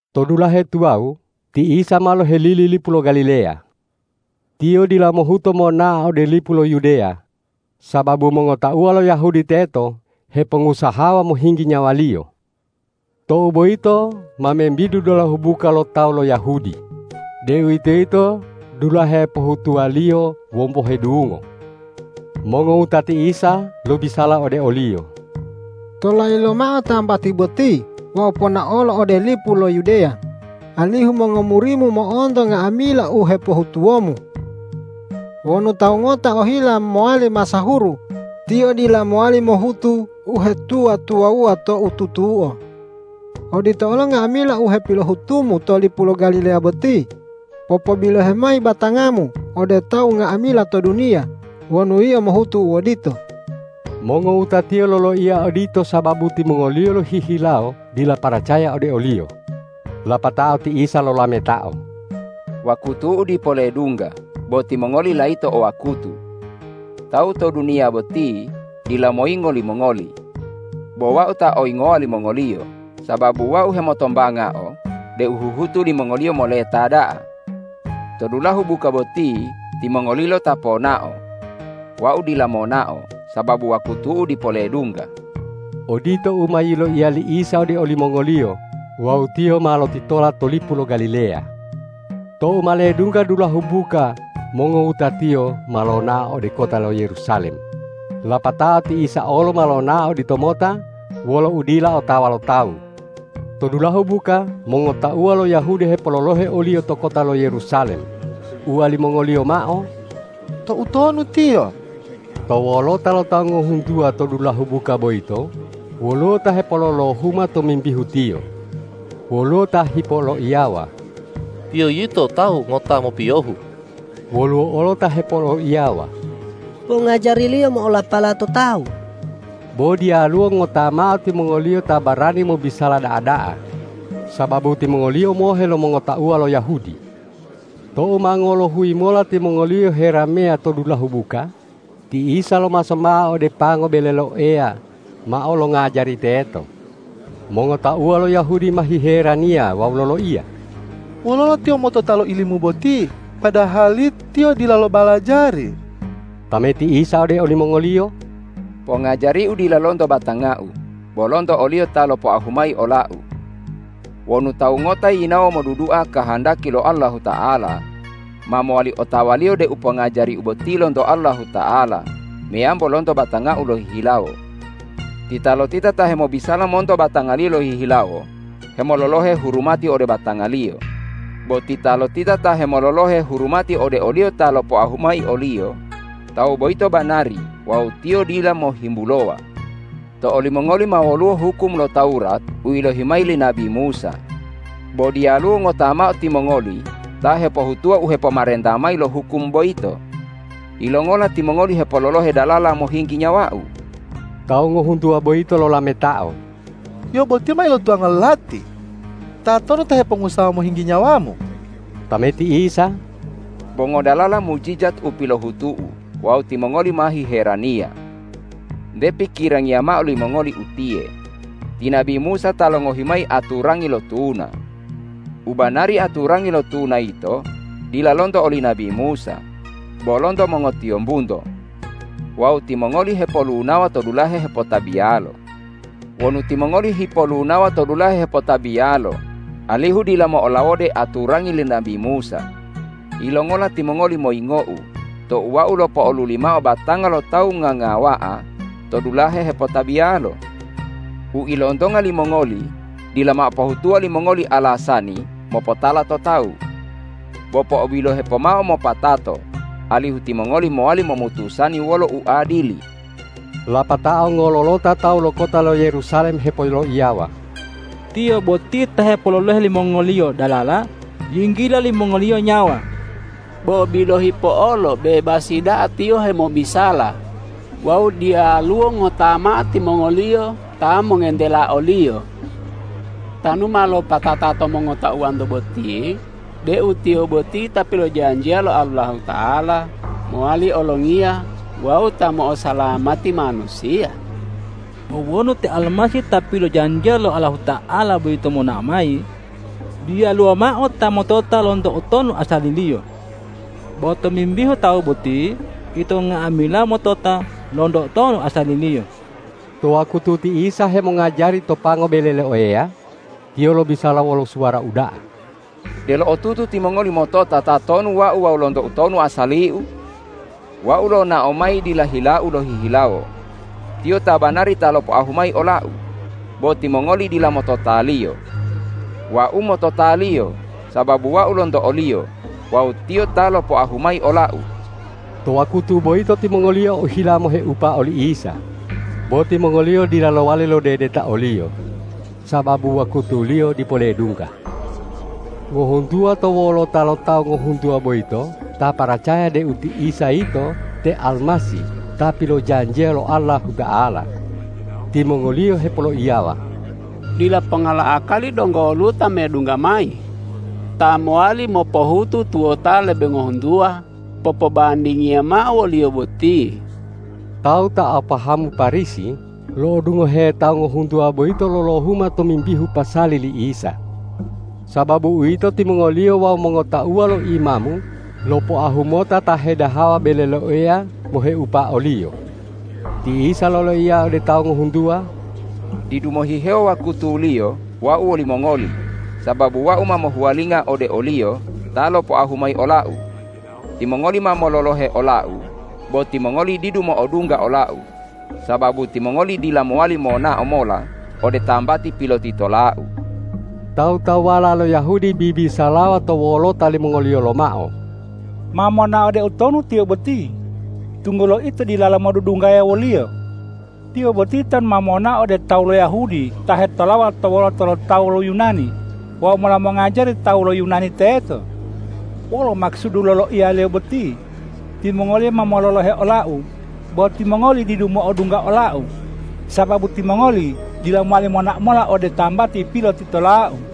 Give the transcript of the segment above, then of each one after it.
To dulahe tuwawu ti Isa ma lohelili lipu lo Galileya. Tiyo dila mohuto monao ode lipu lo Yudeya, sababu mongotauwa lo Yahudi teto hepongusahawa mohinggi nyawa-Liyo. Tou boyito ma membidu dulahu buka lo tawu lo Yahudi, deuwitoyito dulahe pohutuwaliyo wombohe dungo. Mongowutati Isa lobisala ode o-Liyo,”Tolayi lomao tambati boti wawu ponaolo ode lipu lo Yudeya, alihu mongomuri-Mu mo'onto nga'amila u hepohutuwo-Mu. Wonu tawu ngota ohila mowali masahuru, tiyo dila mowali mohutu uhetuwa-tuwawuwa to u tutuo. Odito olo nga'amila u hepilohutu-Mu to lipu lo Galileya boti, popobilohe mayi batanga-Mu ode tawu nga'amila to duniya wonu Yio mohutu u odito.” Mongowuta-Tiyo loloiya odito sababu timongoliyo lohihilawo dila paracaya ode o-Liyo. Lapatao ti Isa lolametao,”Wakutu-U dipo ledungga, bo timongoli layito o wakutu. Tawu to duniya boti dila moyingo limongoli. Bo Wau ta oyingowa limongoliyo, sababu Wau hemotombangao deu huhutu limongoliyo moleta da'a. To dulahu buka boti timongolilo ta ponao. Wau dila monao, sababu wakutu-U dipo ledungga.” Odito u ma yiloiya li Isa ode olimongoliyo wawu Tiyo ma lotitola to lipu lo Galileya. Tou ma ledungga dulahu buka mongowuta-Tiyo ma lonao ode kota lo Yerusalem, lapatao ti Isa olo ma lonao oditomota wolo udila otawa lo tawu. To dulahu buka mongotauwa lo Yahudi hepololohe o-Liyo to kota lo Yerusalem, uwalimongoliyo mao,”Toutonu Tiyo?” To wolota lo tawu ngohuntuwa to dulahu buka boyito woluwo ta hepololohuma tomimbihu Tiyo. Woluwo ta hipoloiyawa,”Tiyo yito tawu ngota mopiyohu.” Woluwo olo ta hepoloiyawa,”Pongajari-Liyo mo'olapala to tawu.” Bo diyaluwo ngota mao timongoliyo ta barani mobisala da'a-da'a, sababu timongoliyo mohe lo mongotauwa lo Yahudi. Tou ma ngolohuyi mola timongoliyo herameya to dulahu buka, ti Isa lomaso mao ode pango bele lo Eya mao longajari teto. Mongotauwa lo Yahudi ma hiheraniya wawu loloiya,”Wololo Tiyo motota lo ilimu boti, padahali Tiyo dila lo balajari?” Tameti Isa ode olimongoliyo,”Pongajari-U dila lonto batanga-U, bo lonto o-Liyo ta lopoahu mayi ola-U. Wonu tawu ngota yinawo modudua kahandaki lo Allahuta'ala, ma mowali otawaliyo deu pongajari-U boti lonto Allahuta'ala meyambo lonto batanga-U lohihilawo. Titalotita ta hemobisala monto batangaliyo lohihilawo hemololohe hurumati ode batangaliyo; bo titalotita ta hemololohe hurumati ode o-Liyo ta lopoahu mayi oliyo, tawu boyito banari wawu tiyo dila mohimbulowa. To olimongoli ma woluwo hukum lo Tawurat u yilohi mayi li nabi Musa. Bo diyaluwo ngota mao timongoli ta hepohutuwa u hepomarenta mayi lo hukum boyito. Yilongola timongoli hepololohe dalala mohinggi nyawa-U?” Tawu ngohuntuwa boyito lolametao,”Yio boti ma ilotuwanga lo lati! Tatonu ta hepongusahawa mohinggi nyawa-Mu?” Tameti Isa,”Bo ngodalala mujijat u piloihutu-U wawu timongoli ma hiheraniya. Nte pikirangiya mao limongoli utiye, ti nabi Musa ta longohi mayi aturangi lo tuna. U banari aturangi lo tuna yito dila lonto oli nabi Musa, bo lonto mongotiyombunto. Wawu timongoli hepolunawa to dulahe hepotabiyalo. Wonu timongoli hipolunawa to dulahe hepotabiyalo alihu dila mo'olawode aturangi li nabi Musa, yilongola timongoli moyingo-U tou Wau lopo'oluli mao batanga lo tawu ngangawa'a to dulahe hepotabiyalo? U ilontonga limongoli dila mao pohutuwa limongoli alasani mopotala to tawu. Bo po'obilohe pomao mopatato, alihu timongoli mowali momutusani wolo uadili.” Lapatao ngololota tawu lo kota lo Yerusalem hepoloiyawa,”Tiyo boti ta hepololohe limongoliyo dalala yinggila limongoliyo nyawa. Bo bilohi po'olo bebasi da'a Tiyo hemobisala wawu diyalu ngota mao timongoliyo ta mongentela o-Liyo. Tanu ma lopatata to mongotauwanto boti deu Tiyo boti Ta pilojanjiya lo Allahuta'ala mowali olongiya wawu Ta mo'osalamati manusiya? Bo wonu te Almasih ta pilojanjiya lo Allahuta'ala boyito monao mayi, diyaluwo mao ta motota lonto utonu asali-Liyo. Bo tomimbihu Tawu boti ito nga'amila motota lonto utonu asali-Liyo.” To wakutu ti Isa hemongajari to pango bele lo Eya, Tiyo lobisala wolo suwara uda'a,”Delo otutu timongoli motota tatonu Wau wawu lonto utonu asali-U? Wau lonao mayi dila hila-U lohihilawo. Tiyo ta banari ta lopoahu mayi ola-U. Bo timongoli dila motota-Liyo. Wau motota-Liyo, sababu Wau lonto o-Liyo wawu Tiyo ta lopoahu mayi ola-U.” To wakutu boyito timongoliyo ohila moheupa oli Isa, bo timongoliyo dila lowali lodedeta o-Liyo, sababu wakutuliyo dipo ledungga. Ngohuntuwa to wolota lo tawu ngohuntuwa boyito ta paracaya deu ti Isa yito te Almasih ta pilojanjiya lo Allahuta'ala. Timongoliyo hepoloiyawa,”Dila ponga lo akali donggo woluwo ta medungga mayi, ta mowali mopohutu tuwota lebe ngohuntuwa popobandingiyo mao wo-Liyo boti.” Tawu ta o pahamu Parisi lo'odungohe tawu ngohuntuwa boyito lolohuma tomimbihu pasali li Isa. Sababu uwito, timongoliyo wawu mongotauwa lo imamu lopoahu mota ta hedahawa bele lo Eya moheupa o-Liyo. Ti Isa loloiya ode tawu ngohuntuwa,”Didu mohihewo wakutuliyo Wau wolimongoli, sababu Wau ma mohuwalinga ode o-Liyo ta lopoahu mayi ola-U. Timongoli ma mololohe ola-U, bo timongoli didu mo'odungga ola-U, sababu timongoli dila mowali monao mola ode tambati pilotitola-U.” Tawu-tawuwala lo Yahudi bibisalawa to wolota limongoliyo lomao,”Ma monao ode utonu Tiyo boti, tunggulo ito dilalo modudunggaya wo-Liyo? Tiyo boti tanu ma monao ode tawu lo Yahudi ta hetolawa to wolota lo tawu lo Yunani wawu mola mongajari tawu lo Yunani teto? Wolo makusudu loloiya-Liyo boti, ’Timongoli ma mololohe ola-U, bo timongoli didu mo'odungga ola-U, sababu timongoli dila mowali monao mola ode tambati pilotitola-U?’”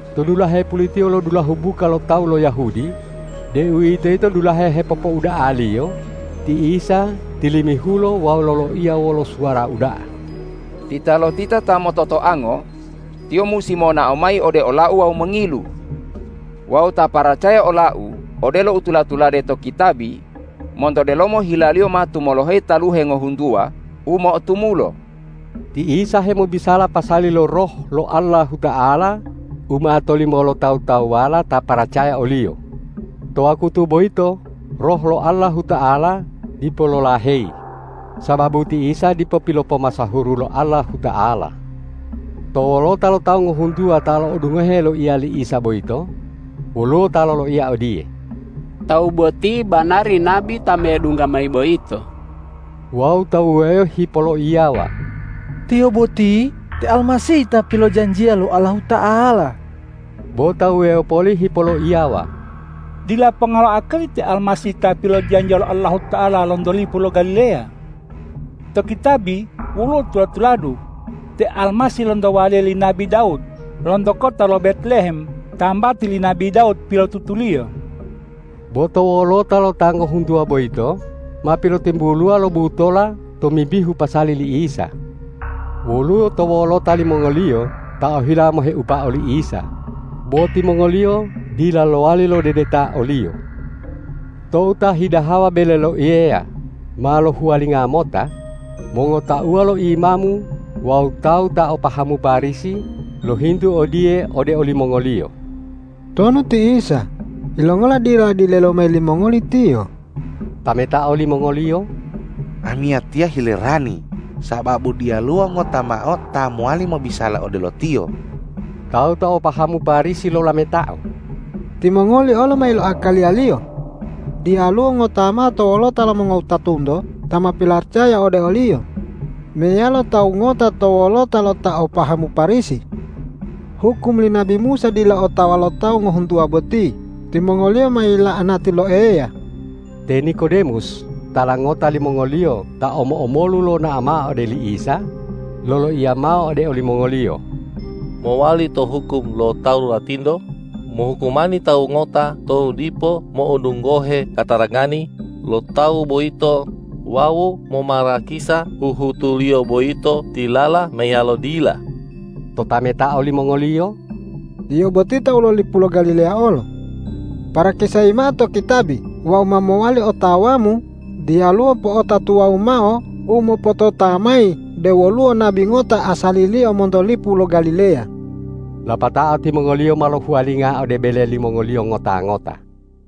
To dulahe pulitiyo lo dulahu buka lo tawu lo Yahudi, deuwitoyito dulahe hepopouda'aliyo, ti Isa tilimihulo wawu loloiya wolo suwara uda'a,”Titalotita ta mototoango, tiyo musi monao mayi ode ola-U wawu mongilu! Wawu ta paracaya ola-U, odelo u tula-tulade to kitabi: Monto delomo hilaliyo ma tumoloheyi taluhe ngohuntuwa u mo'otumulo.” Ti Isa hemobisala pasali lo Roh lo Allahuta'ala u ma tolimo lo tawu-tawuwala ta paracaya o-Liyo; to wakutu boyito Roh lo Allahuta'ala dipo lolaheyi, sababu ti Isa dipo pilopomasahuru lo Allahuta'ala. To wolota lo tawu ngohuntuwa ta lo'odungohe loiya li Isa boyito, woluwo ta loloiya odiye,”Tawu boti banari nabi ta medungga mayi boyito!” Wawu ta wuwewo hipoloiyawa,”Tiyo boti te Almasih ta pilojanjiya lo Allahuta'ala.” Bo ta wuwewo poli hipoloiyawa,”Dila ponga lo akali te Almasih ta pilojanjiya lo Allahuta'ala lonto lipu lo Galileya! To kitabi woluwo tula-tuladu, te Almasih lonto waliya li nabi Dawud lonto kota lo Betlehem tambati li nabi Dawud pilotutuliyo.” To wolota lo ta ngohuntuwa boyito ma pilotimbuluwa lo butola tomimbihu pasali li Isa. Woluwo to wolota limongoliyo ta ohila moheupa oli Isa, bo timongoliyo dila lowali lodedeta o-Liyo. Tou ta hidahawa bele lo Eya ma lohuwalinga mota, mongotauwa lo imamu wawu tawu ta o pahamu Parisi lohintu odiye ode olimongoliyo,”Tonu ti Isa, yilongola dila dilelomayi limongoli Tiyo?” Tametao limongoliyo,”Amiyatiya hilerani sababu diyaluwo ngota mao ta mowali mobisala odelo Tiyo!” Tawu ta o pahamu Parisi lolametao,”Timongoli olo ma iloakaliya-Liyo. Diyaluwo ngota mao to wolota lo mongotauwanto ta ma pilaracaya ode o-Liyo, meyalo tawu ngota to wolota lo ta o pahamu Parisi. Hukum li nabi Musa dila otawa lo tawu ngohuntuwa boti; timongoliyo ma yila'anati lo Eya.” Te Nikodemus tala ngota limongoliyo ta omo-omolu lonao mao ode li Isa, loloiya mao ode olimongoliyo, ”Mowali to hukum lo Tawuratinto mohukumani tawu ngota tou dipo mo'odungohe katarangani lo tawu boyito wawu momarakisa huhutuliyo boyito tilala meyalo dila?” Totametao limongoliyo,”Yio boti tawu lo lipu lo Galileya olo. Parakisayi mao to kitabi wawu ma mowali otawamu diyaluwo po'ota tuwawu mao u mopotota mayi deu woluwo nabi ngota asaliliyo monto lipu lo Galileya!” Lapatao timongoliyo ma lohuwalinga ode bele limongoliyo ngota-ngota.